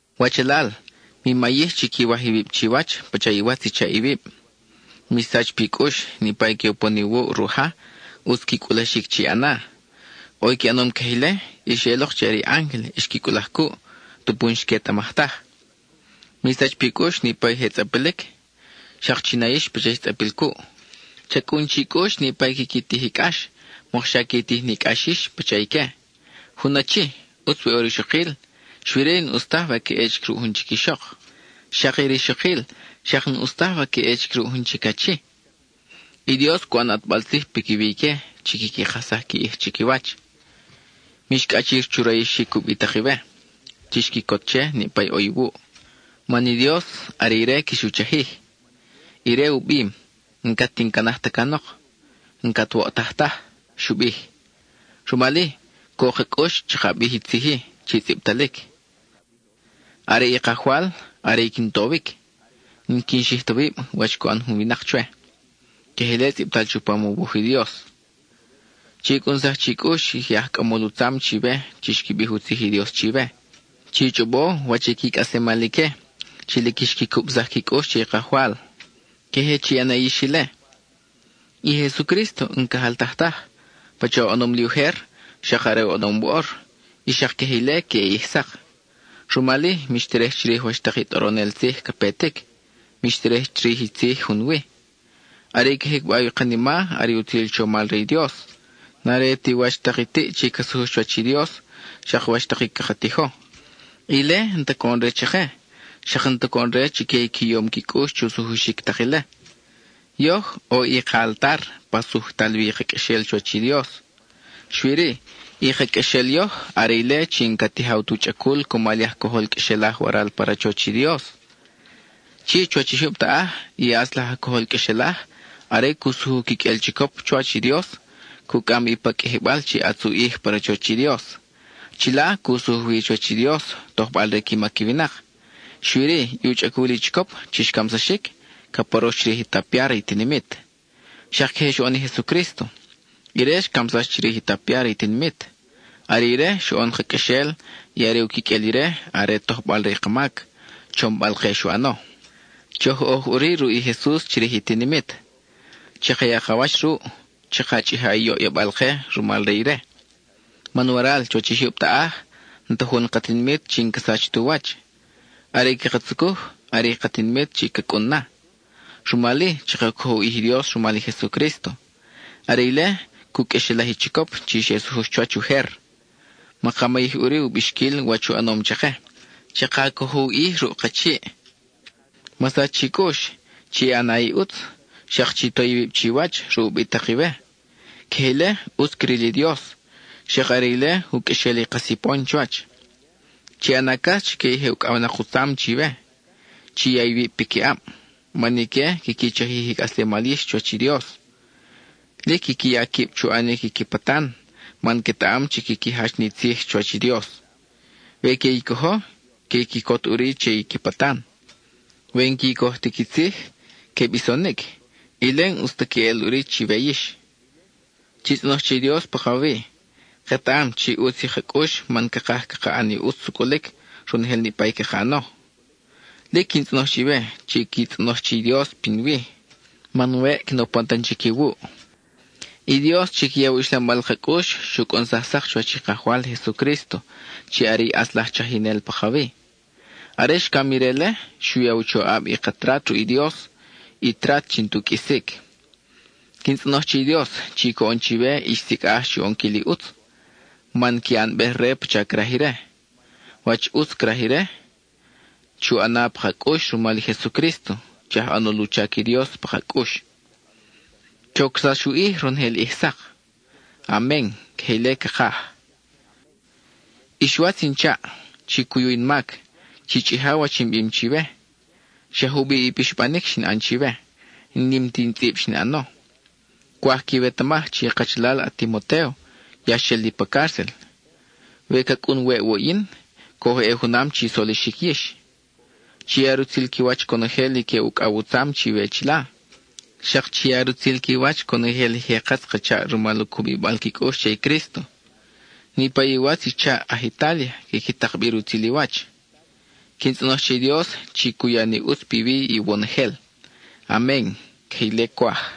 Wachalal, mi mayij chi quiwaj iwib chiwach pacha iwatz i chaʼ iwib. Mi sach pi cʼux, niʼpa i que upon iwuʼ ruʼ ja, ʼutz qui cʼulaxic chi ʼana. ʼO i qui ʼanom queje ile, y xeʼelok chi are i ángel xqui cʼulaj cuʼ, tupu n-xquetamaj taj. Mi sach pi cʼux niʼpa i je tzʼapilic; xak chi na yix pacha ix tzʼapil cuʼ. Cha cʼun chi cʼux niʼpa i quiqui tij i cʼax, mokxa qui tij ni cʼax yix pacha ique. Jun achi, ʼutz we ʼo rixokil, xui-ri, n-ʼus taj we ca ʼe chic ruʼ jun chic ixok. Xak i rixokil, xak n-ʼus taj we ca ʼe chic ruʼ jun chic achi. I Dios cu ʼan ʼatbal tzij piquiwi ique chi quiqui kajsaj qui ʼij chiquiwach. Mix cʼachir chu rayixic ubitak iwe; chix quicot che niʼpa ʼo iwuʼ, man i Dios are ire quix u chajij. Ire u bim: “N-cat in canaj ta canok; n-cat woʼtaj taj”, xu bij. Rumal-i, co ka cʼux chaka bij i tzij-i chi tzʼibtalic: Are i Kajwal, are i quin towic; n-quin xij ta wib wach cu ʼan jun winak chwe. (Queje ile tzʼibtal chupam u wuj i Dios.) Che i cʼunsaj chi cʼux i je aj cʼamol u tzam chiwe chi xqui bij u tzij i Dios chiwe. Chi chʼobo wach i qui cʼaslemal ique, chi lic xqui cubsaj qui cʼux che i Kajwal; queje chi ʼana yix ile. I Jesucrísto n-ca jaltaj taj. Pacha oʼonom li ujer, xak are oʼonom woʼor, y xak queje ile queʼe ʼij sak. Rumal-i, mix terej chirij wach tak i tʼoronel tzij ca petic, mix terej chirij i tzij junwi. Are i ca jicbaw i kanima are i utzil chomal re i Dios, n-are ti wach tak i tiʼ chi ca sujux chuwach i Dios, xak wach tak i caka tijo. Ile n-ta coʼon-re chake, xak n-ta coʼon-re chique i qui yom qui cʼux chu sujuxic tak ile. Yoj, ʼo i ka altar pa sujtal wi i ka qʼuexel chuwach i Dios. Xui-ri, i ka qʼuexel yoj, are ile chi n-ca tijaw tu chʼacul cumal i aj cojol qʼuexelaj waral pa rachoch i Dios. Chi chuwach i jyub taʼaj, i ʼatz laj aj cojol qʼuexelaj, are cu sujuj u quiqʼuel chicop chuwach i Dios, cu cʼam bi pa qʼuijibal chi ʼatz u ʼij pa rachoch i Dios. Chila, cu sujuj wi chuwach i Dios, tojbal re qui mac i winak; xui-ri, i u chʼacul i chicop chi xcamsaxic, ca porox chirij i tapia re i tinimit. Xak queje xoʼon i Jesucrísto. Ire xcamsax chirij i tapia re i tinimit. Are ire xoʼon ka qʼuexel, y are u quiqʼuel ire are tojbal re i ka mac, chombal-ke xu ʼano. Choj oj ʼuri ruʼ i Jesus chirij i tinimit. Chaka ya ka wach ruʼ; chaka chʼija i yoʼyabal-ke rumal re ire. Man waral chuwach i jyub taʼaj, n-ta jun ka tinimit chi n-ca sach tu wach. Are i caka tzucuj, are i ka tinimit chi ca cʼun na. Rumal-i, chaka cojo u ʼij i Dios rumal i Jesucrísto. Are ile cu qʼuexelaj i chicop chi xe sujux chuwach ujer; maka mayij ʼuri u bixquil wach u ʼanom chake. ¡Chaka cojo u ʼij ruʼ ka chiʼ! Ma sach chi cʼux, chi ʼana i ʼutz, xak chi to iwib chiwach ruʼ ubitak iwe. Queje ile, ʼutz cril i Dios, xak are ile u qʼuexel i ka sipon chuwach. Chi ʼana cas chique i je ucʼawnak u tzam chiwe; chi ya iwib piquiʼab. Man ique quiqui chajij i cʼaslemal yix chuwach i Dios. Lic quiqui ya quib chu ʼanic i qui patan, man quetaʼam chi quiqui jach ni tzij chuwach i Dios. We que i cojo, que quicot ʼuri che i qui patan. We n-qui coj ti qui tzij, que bisonic; ile n-ʼus ta queʼel ʼuri chiwe yix. Chi tzʼonoj che i Dios pakawi. Ketaʼam chi ʼutz i ka cʼux man cakaj caka ʼan i ʼutz sucʼulic, ronojel niʼpa i caka ʼano. Lic quin tzʼonoj chiwe chi qui tzʼonoj che i Dios pinwi, man weʼ quin upon tan chic iwuʼ. I Dios chi ca yaw i uxlambal ka cʼux xu cʼunsaj sak chuwach i Kajwal Jesucrísto chi are i ʼatz laj Chajinel pakawi. Are xcam ire-le, xu ya u choʼab i ka trat ruʼ i Dios, i trat chi n-tu qʼuisic. Quin tzʼonoj che i Dios chi coʼon chiwe ix sicʼaj chu ʼonquil i ʼutz, man qui ʼanbej re pacha craj ire. Wach i ʼutz craj ire chake, chu ʼana pa ka cʼux rumal i Jesucrísto, chi aj ʼanol u chac i Dios pa ka cʼux. ¡Chocsax u ʼij ronojel ʼij sak! Amen (Queje ile cakaj). Ix watz in chaʼ, chi cuyu in mac, chi chʼija wach in bim chiwe, xa jubiʼ i pixbanic xin ʼan chiwe, n-nim ti in tzʼib xin ʼano. Cwaj quiwetamaj chi i kachalal a-Timotéo ya xel li pa cárcel. We ca cʼun weʼ wuʼ yin, coj ʼe junam chi solixic yix. Chi ya rutzil qui wach conojel i que ucʼaw u tzam chiwe chila. Xak chi ya rutzil qui wach conojel i je katz ka chaʼ rumal u cubibal qui cʼux che i Crísto. Niʼpa i iwatz i chaʼ aj Itália quiqui tak bi rutzil i wach. Quin tzʼonoj che i Dios chi cu ya ni ʼutz piwi iwonojel. Amen (Queje ile cwaj).